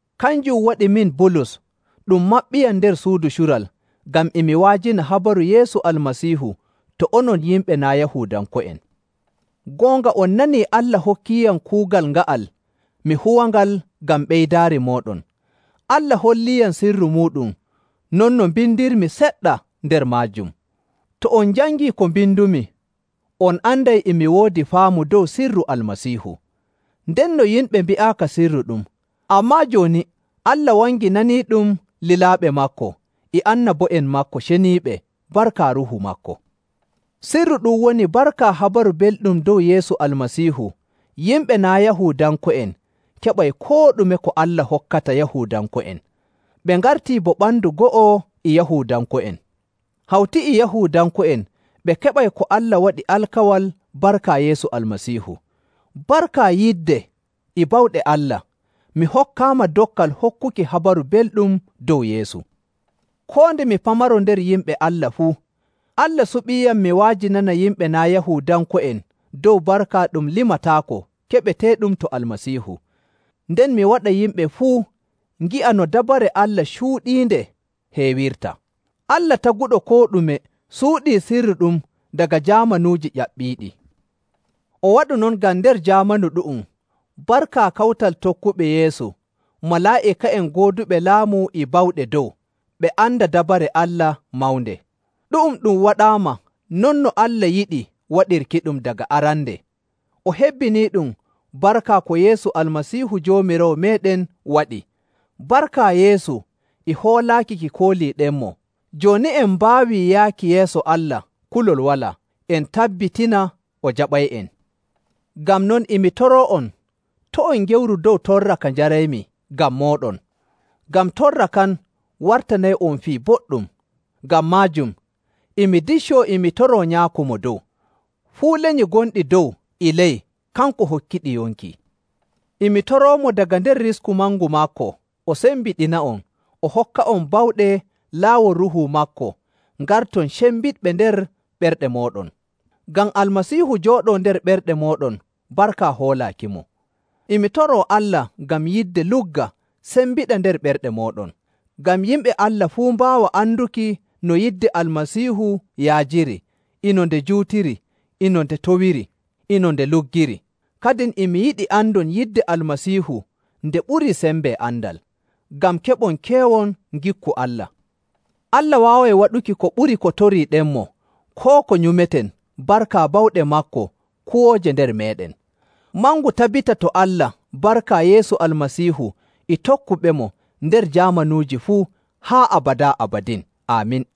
Kanjum waɗi min, Bulus, ɗum maɓɓiyam nder suudu cural ngam e mi wa'ajina habaru Yeesu Almasiihu to onon yimɓe naa' Yahuudanko'en. Goonga on nanii Allah hokkiiyam kuugal nga'al mi huwangal ngam ɓeydaari mooɗon. Allah holliiyam sirru muuɗum, non no mbindirmi seɗɗa nder maajum. To on jangii ko mbindumi, on anday e mi woodi faamu dow sirru Almasiihu. Ndenno yimɓe mbi'aaka sirru ɗu'um, ammaa jooni Allah wanginaniiɗum lilaaɓe maako e annabo'en maako ceniiɓe barka Ruuhu maako. Sirru ɗum woni barka Habaru Belɗum dow Yeesu Almasiihu yimɓe naa' Yahuudanko'en keɓay koo ɗume ko Allah hokkata Yahuudanko'en. Ɓe ngartii bo ɓandu go'o e Yahuudanko'en. Hawti e Yahuudanko'en ɓe keɓay ko Allah waɗi alkawal barka Yeesu Almasiihu.. Barka yidde e bawɗe Allah, mi hokkaama dokkal hokkuki Habaru Belɗum dow Yeesu. Koo nde mi pamaro nder yimɓe Allah fuu, Allah suɓiiyam mi wa'ajinana yimɓe naa' Yahuudanko'en dow barka ɗum limataako keɓeteeɗum to Almasiihu. Nden mi waɗa yimɓe fuu ngi'a no dabare Allah cuuɗiinde heewirta. Allah taguɗo koo ɗume suuɗii sirru ɗum daga jaamanuuji ƴaɓɓiiɗi. O waɗu non ngam nder jaamanu ɗu'um, barka kawtal tokkuɓe Yeesu, malaa'ika'en gooduɓe laamu e bawɗe dow, ɓe anda dabare Allah mawnde. Ɗu'um ɗum waɗaama non no Allah yiɗi waɗirkiɗum daga arande, o hebbiniiɗum barka ko Yeesu Almasiihu Joomiraawo meeɗen waɗi. Barka Yeesu e hoolaaki ki kooliiɗenmo, jooni en mbaawi yaaki yeeso Allah kulol walaa, en tabbitina o jaɓay'en. Ngam non, e mi toroo'on, to' on ngewru dow torra ka njaraymi ngam mooɗon, ngam torra kan wartanay'on fii boɗɗum. Ngam maajum, e mi diccoo e mi toroo Nyaako Mo Dow. Fuu lenyi gonɗi dow e ley, kanko hokkiɗi yonki. E mi toroomo daga nder risku mangu maako o sembiɗina'on, o hokka'on bawɗe laawol Ruuhu maako ngarton cembiɗɓe nder ɓerɗe mooɗon, ngam Almasiihu jooɗoo nder ɓerɗe mooɗon barka hoolaakimo. E mi toroo Allah ngam yidde lugga sembiɗa nder ɓerɗe mooɗon, ngam yimɓe Allah fuu mbaawa anduki no yidde Almasiihu yaajiri, e no nde juutiri, e no nde towiri, e no nde luggiri. Kadin e mi yiɗi andon yidde Almasiihu nde ɓurii sembe andal, ngam keɓon keewon ngikku Allah. Allah waaway waɗuki ko ɓuri ko toriiɗenmo koo ko nyumeten barka bawɗe maako kuwooje nder meeɗen. Mangu tabbita to Allah barka Yeesu Almasiihu e tokkuɓemo nder jaamanuuji fuu haa abadaa abadin! Aamin.